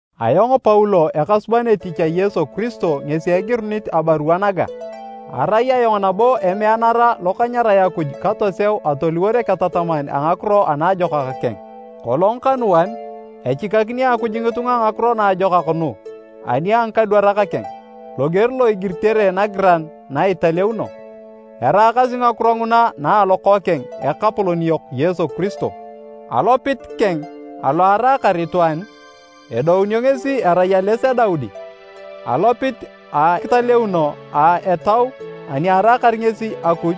Ayong Paulo ekasuban etich a Yesu Kiristo ngesi egirunit abarua naga. Arai ayong nabo emeanara lo kanyarae Akuj katoseu atoliwor eketataman a Ngakiro a Naajokak keng. Kolong kanuan, echikakini Akuj ngitunga Ngakiro Naajokak nu ani a ngikadwarak keng, loger lo igiritere Nagiran na italeuno. Eraakasi ngakiro nguna na a Lokookeng, Ekapolon yok Yesu Kiristo. Alopit keng alo araakar itwaan, edounio ngesi erai ales a Daudi. Alopit a akitaleuno a Etau ani araakar ngesi Akuj,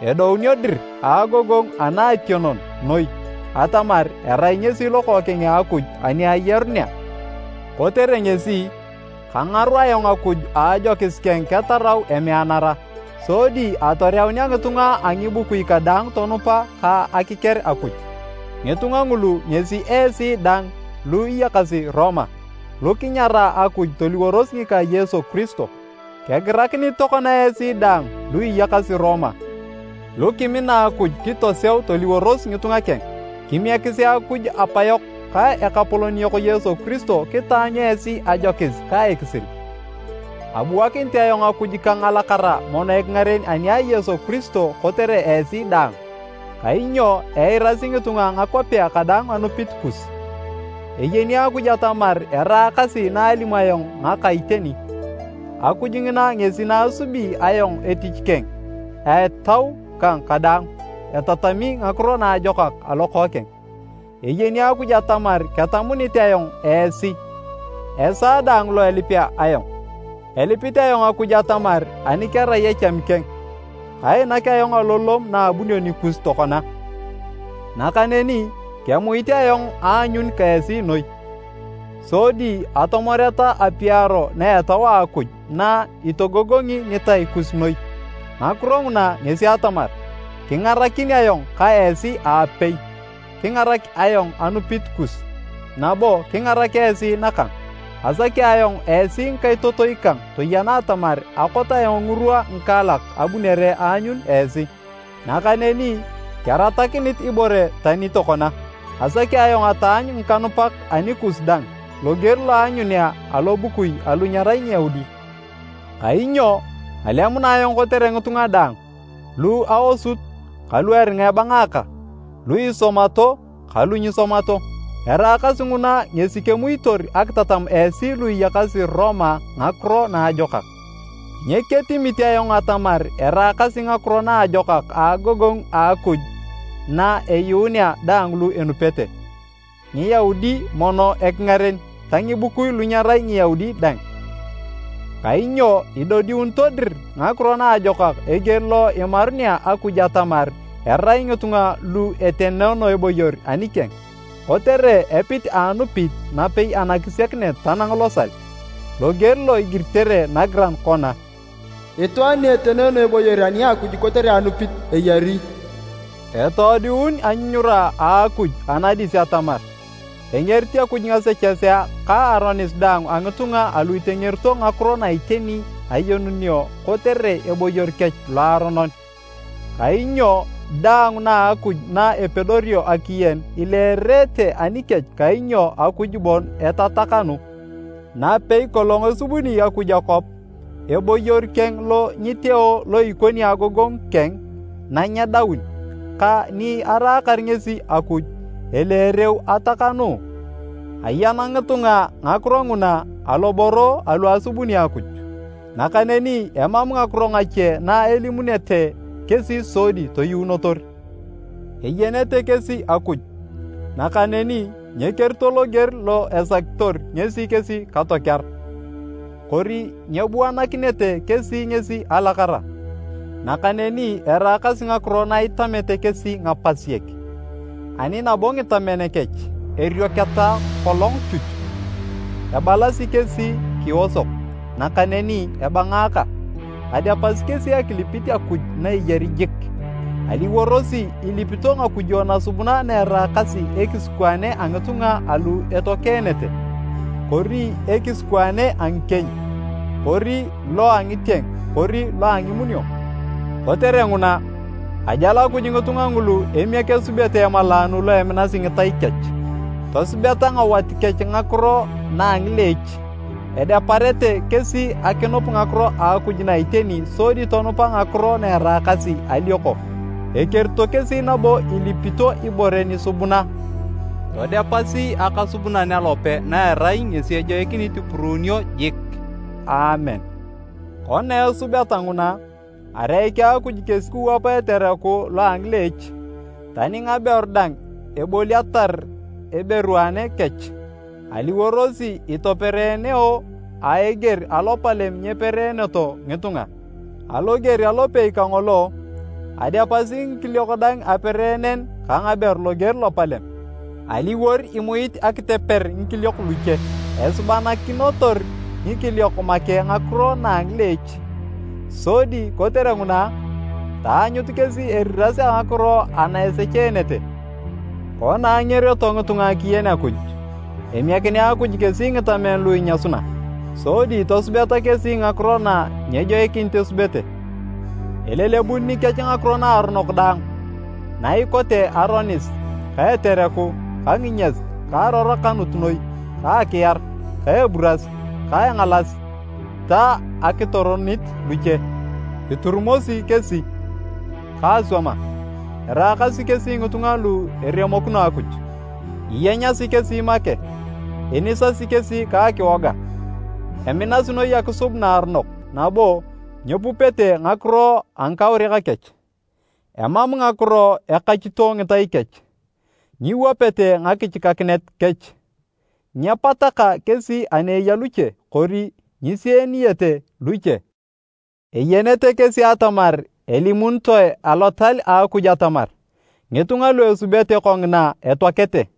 edodiunio dir a agogongu anaationon noi atamar erai ngesi Lokookeng a Akuj ani ayarunea. Kotere ngesi, kangaru ayong Akuj a ajokis keng ketarau emeanara, sodi atoreunea ngitunga a ngibukui kadaang tonupa ka akiker Akuj. Ngitunga ngulu ngesi esi dang lu iyakasi Roma, lu kinyara Akuj toliworos ngika Yesu Kiristo. Kegirakinit tokona esi daang lu iyakasi Roma, lu kimina Akuj kitoseu toliworos ngitunga keng. Kimiekisi Akuj Apayok ka Ekapolon yok Yesu Kiristo kitaanyu esi ajokis ka ekisil. Abuakinit ayong Akuj kang alakara mono ekingaren ani a Yesu Kiristo kotere esi daang, kainyo eirasi ngitunga a ngakwapea kadaang anupit kus. Eyeni Akuj atamar eraakasi naalimu ayong ngaka iteni, Akuj ngina ngesi naasubi ayong etich keng a etau kang kadaang etatami Ngakiro Naajokak a Lokookeng. Eyeni Akuj atamar ketamunit ayong esi esaa daang lo elipea ayong. Elipit ayong Akuj atamar ani kerai echami keng, kainak ayong alolom naabunio nikus tokona. Nakaneni kemuit ayong aanyun ka esi noi, sodi atomoreta apiaro na etau a Akuj na itogogongi ngitai kus noi. Ngakiro nguna ngesi atamar, kingarakin ayong ka esi aapei, kengarak ayong anupit kus, nabo kingarak esi nakang. Asaki ayong esi ngikaitotoi kang toyena atamar akot ayong ngirwa ngikaalak abunere aanyun esi, nakaneni keratakinit ibore tani tokona. Asaki ayong ataanyu ngikanupak anikus dang loger lo aanyunea alobukui alu nyerai Ngiyaudi. Kainyo alemuna ayong kotere ngitunga daang, lu aosut kalu eringa ebangaaka, lu isomato kalu nyisomato. Eraakasi nguna ngesi kemuitor akitatam esi lu iyakasi Roma Ngakiro Naajokak. Nyeketimit ayong atamar eraakasi Ngakiro Naajokak agogongu a Akuj na eyuunea daang lu enupete, Ngiyaudi mono ekingaren ta ngibukui lu nyerai Ngiyaudi dang. Kainyo idodiunito dir Ngakiro Naajokak eger lo imarunea Akuj atamar erai ngitunga lu etenoono eboyor anikeng, kotere epit a anupit napei anakisiakinet tanang losal. Loger lo igiritere nagiran kona, “Itwaan ni etenoono eboyor ani a Akuj kotere anupit, eyari.” Etoodiun anyunyura a Akuj anadis atamar, engerit Akuj ngasechesea ka aronis daang a ngitunga alu itengerito ngakiro na iteni ayenunio kotere eboyor kech loaronon. Kainyo daang na a Akuj na epedorio akiyen, ileerete anikech kainyo Akuj bon etatakanu. Napei kolong esubuni Akuj akwap, eboyor keng lo nyiteo lo ikoni agogongu keng nanyedaun ka ni araakar ngesi Akuj, eleereu atakanuu. Ayan ngitunga ngakiro nguna aloboro alu asubuni Akuj. Nakaneni emam ngakiro ngache na elimunete kesi sodi toyuunotor! Eyenete kesi Akuj, nakaneni nyekerito loger lo esakitor ngesi kesi katokear, kori nyebuanakinete kesi ngesi alakara. Nakaneni eraakasi ngakiro na itamete kesi ngapasiek, ani nabo ngitamen kech, erioketa kolong chuch. Ebalasi kesi kiosok, nakaneni ebangaaka, adepasi kesi akilip Akuj na eyari jik, aliworosi ilipito ngakujo nasubuna na eraakasi ekisikwaane a ngitunga alu etoakeenete, kori ekisikwaane a ngikieny, kori lo a ngitieng kori lo a ngimunio. Kotere nguna, ajal Akuj ngitunga ngulu emiek esubete emalaanu lo eminasi ngitai kech. Tosubeta ngawat kech ngakiro na a ngileech. Edeparete kesi akinup ngakiro a Akuj na iteni sodi tonupa ngakiro na eraakasi alioko. Ekerito kesi nabo ilipito ibore nisubuna todepasi Akasubunan alope na erai ngesi ejoikinit ipuruunio jik! Aamen. Kona esubeta nguna, areiki Akuj kesi kiwapa etereku lo a ngileech. Tani ngaberu dang eboliatar eberuane kech, aliworosi itopereeneo a eger alopalem nyepereeneto ngitunga. Aloger alopei kangolo, adepasi ngikiliok dang apereenen ka ngaberu loger lopalem, aliwor imuit akiteper ngikiliok luche. Esubanakinotor ngikiliok make ngakiro na a ngileech, sodi kotere nguna, taanyut kesi eriras a ngakiro ana esecheenete. Kona angerioto ngitunga akiyen Akuj, emiekinea Akuj kesi ngitamen lu inyasuna, sodi tosubeta kesi ngakiro na nyejoikinit esubete. Elelebun nikech ngakiro naaronok daang, na ikote aronis ka etereku ka nginyas ka arorokanut noi ka akiar ka eburas ka engalas ta akitoronit luche. Iturumosi kesi ka aswama, eraakasi kesi ngitunga lu eremokino Akuj. Iyenyasi kesi make, inisasi kesi ka akiwoga. Eminasi noi akisub naaronok nabo nyepupete ngakiro a ngikauriak kech. Emam ngakiro ekachito ngitai kech, nyiwapete ngakichikakinet kech. Nyepataka kesi ani eya luche kori nyisieniyete luche. Eyenete kesi atamar elimunitoe alotal a Akuj atamar ngitunga lu esubete kongina, etoakete.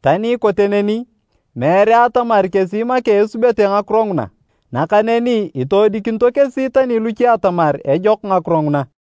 Tani ikote neni, meere atamar kesi make esubete ngakiro nguna, nakaneni itoodikinito kesi tani luche atamar ejok ngakiro nguna.